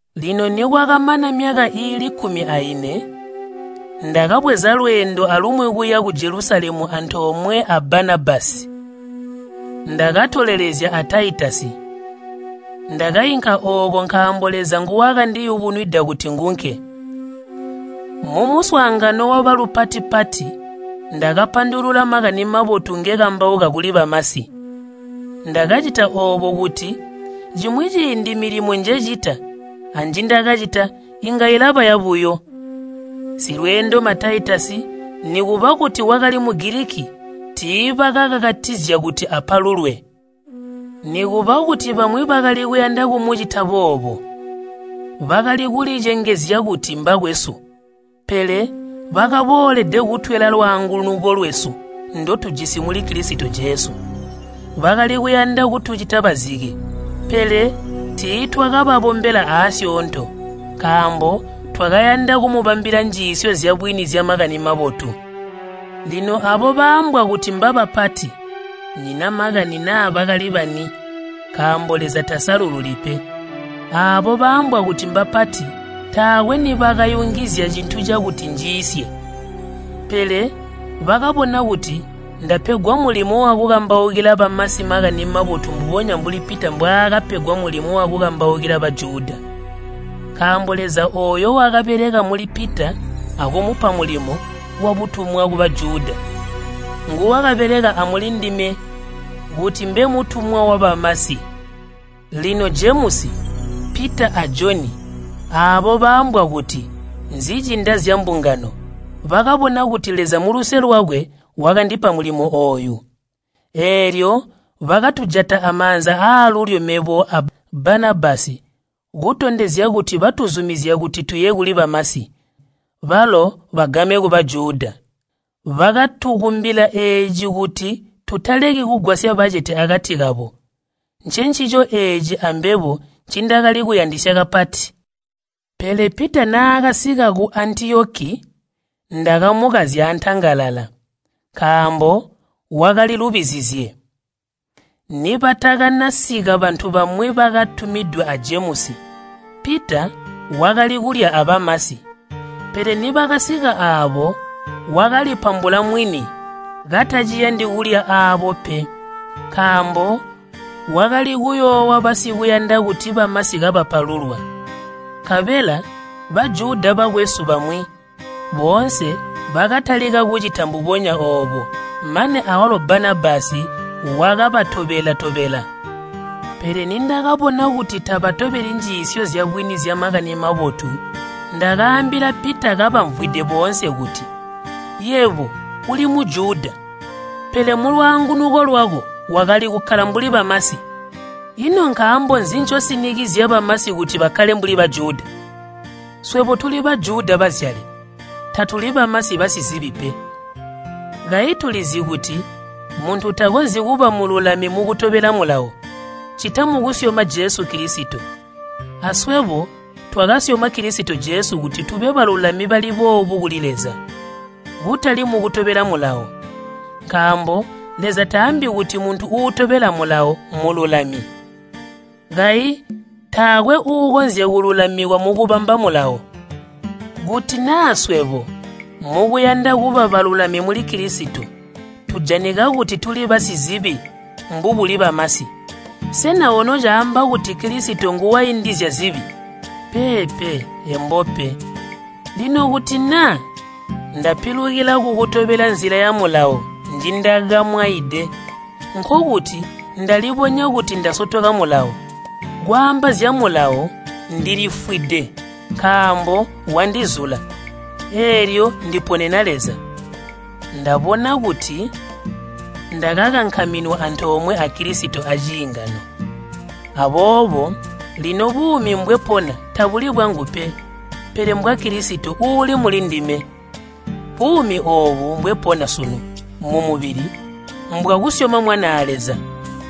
Lino nikwakamana myaka iili kkumi aine, ndakabweza lweendo alumwi kuya ku Jelusalemu antoomwe a Banabasi, ndakatolelezya a Taitasi. Ndakainka ooko nkaambo Leza nguwakandiyubunwida kuti ngunke. Mumuswaangano wabalupati-pati ndakapandulula Makani Mabotu ngekambauka kuli bamasi. Ndakacita oobo kuti cimwi ciindi milimo njecita anjindakacita inga ilaba yabuyo. Silweendoma Taitasi nikuba kuti wakali Mugiliki tiibakakakatizya kuti apalulwe, nikuba kuti bamwi bakali kuyanda kumucita boobo. Bakali kulicengezya kuti mbakwesu, pele bakaboolede kutwela lwaangunuko lwesu ndotujisi muli Kilisito Jesu. Bakali kuyanda kutucita bazike, pele tiitwakababombela aasyoonto, nkaambo twakayanda kumubambila njiisyo zyabwini zya Makani Mabotu. Lino aabo baambwa kuti mbabapati (nnyina makani naa bakali bani, nkaambo Leza tasalululi pe) aabo baambwa kuti mbapati taakwe nibakayungizya cintu cakuti njiisye. Pele bakabona kuti ndapegwa mulimo wakukambaukila bamasi Makani Mabotu mbubonya mbuli Pita mbwaakapegwa mulimo wakukambaukila Bajuda. (Nkaambo Leza ooyo wakabeleka muli Pita akumupa mulimo wabutumwa ku Bajuda, nguwakabeleka amuli ndime kuti mbe mutumwa wabamasi.) Lino Jemusi, Pita a Joni aabo baambwa kuti nzicinda zyambungano bakabona kuti Leza muluse lwakwe wakandipa mulimo ooyu. Eelyo bakatujata amaanza aalulyo mebo a Banabasi kutondezya kuti batuzumizya kuti tuye kuli bamasi, balo bagame ku Bajuda. Bakatukumbila eeci kuti tutaleki kugwasya bacete akati kabo. Ncencico eeci ambebo ncindakali kuyandisya kapati. Pele Pita naakasika ku Antiyoki, ndakamukazya antangalala, nkaambo wakali lubizizye. Nibatakanasika bantu bamwi bakatumidwe a Jemusi, Pita wakali kulya abamasi, pele nibakasika aabo wakalipambula mwini kataciyandi kulya aabo pe, nkaambo wakali kuyoowa basikuyanda kuti bamasi kabapalulwa. Nkabela Bajuda bakwesu bamwi boonse bakatalika kucita mbubonya oobo, mane awalo Banabasi wakabatobela-tobela. Pele nindakabona kuti tabatobeli njiisyo zyabwini zya Makani Mabotu, ndakaambila Pita kabamvwide boonse kuti, “Yebo uli Mujuda, pele mulwaangunuko lwako wakali kukkala mbuli bamasi, ino nkaambo nzi ncosinikizya bamasi kuti bakkale mbuli Bajuda?” Swebo tuli Bajuda bazyale, tatuli bamasi basizibi pe. Kayi tulizi kuti muntu takonzyi kuba mululami mukutobela Mulawo, ccita mukusyoma Jesu Kilisito. Aswebo twakasyoma Kilisito Jesu kuti tube balulami bali boobu kuli Leza, kutali mukutobela Mulawo. Nkaambo Leza taambi kuti muntu uutobela Mulawo mmululami. Kayi taakwe uukonzya kululamikwa mukubamba Mulawo. Kuti naa swebo, mukuyanda kuba balulami muli Kilisito, tujanika kuti tuli basizibi mbubuli bamasi, sena ono caamba kuti Kilisito nguwaindizya zibi? Peepe, embo pe! Lino kuti naa ndapilukila kukutobela nzila ya Mulawo njindakamwaide, nkokuti ndalibonya kuti ndasotoka Mulawo. Kwaamba zya Mulawo ndilifwide nkaambo wandizula, eelyo ndiponena Leza. Ndabona kuti ndakakankaminwa antoomwe a Kilisito aciingano. Aboobo lino buumi mbwepona tabuli bwangu pe, pele mbwa Kilisito uuli muli ndime. Buumi oobu mbwepona sunu mumubili mbwakusyoma Mwanaa Leza,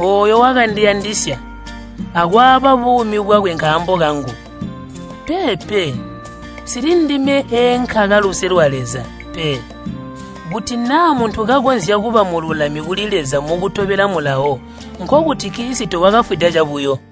ooyo wakandiyandisya akwaaba buumi bwakwe nkaambo kangu. Peepe, nsili ndime eenkaka luse lwa Leza pe. Kuti naa muntu kakonzya kuba mululami kuli Leza mukutobela Mulawo, nkokuti Kilisito wakafwida cabuyo.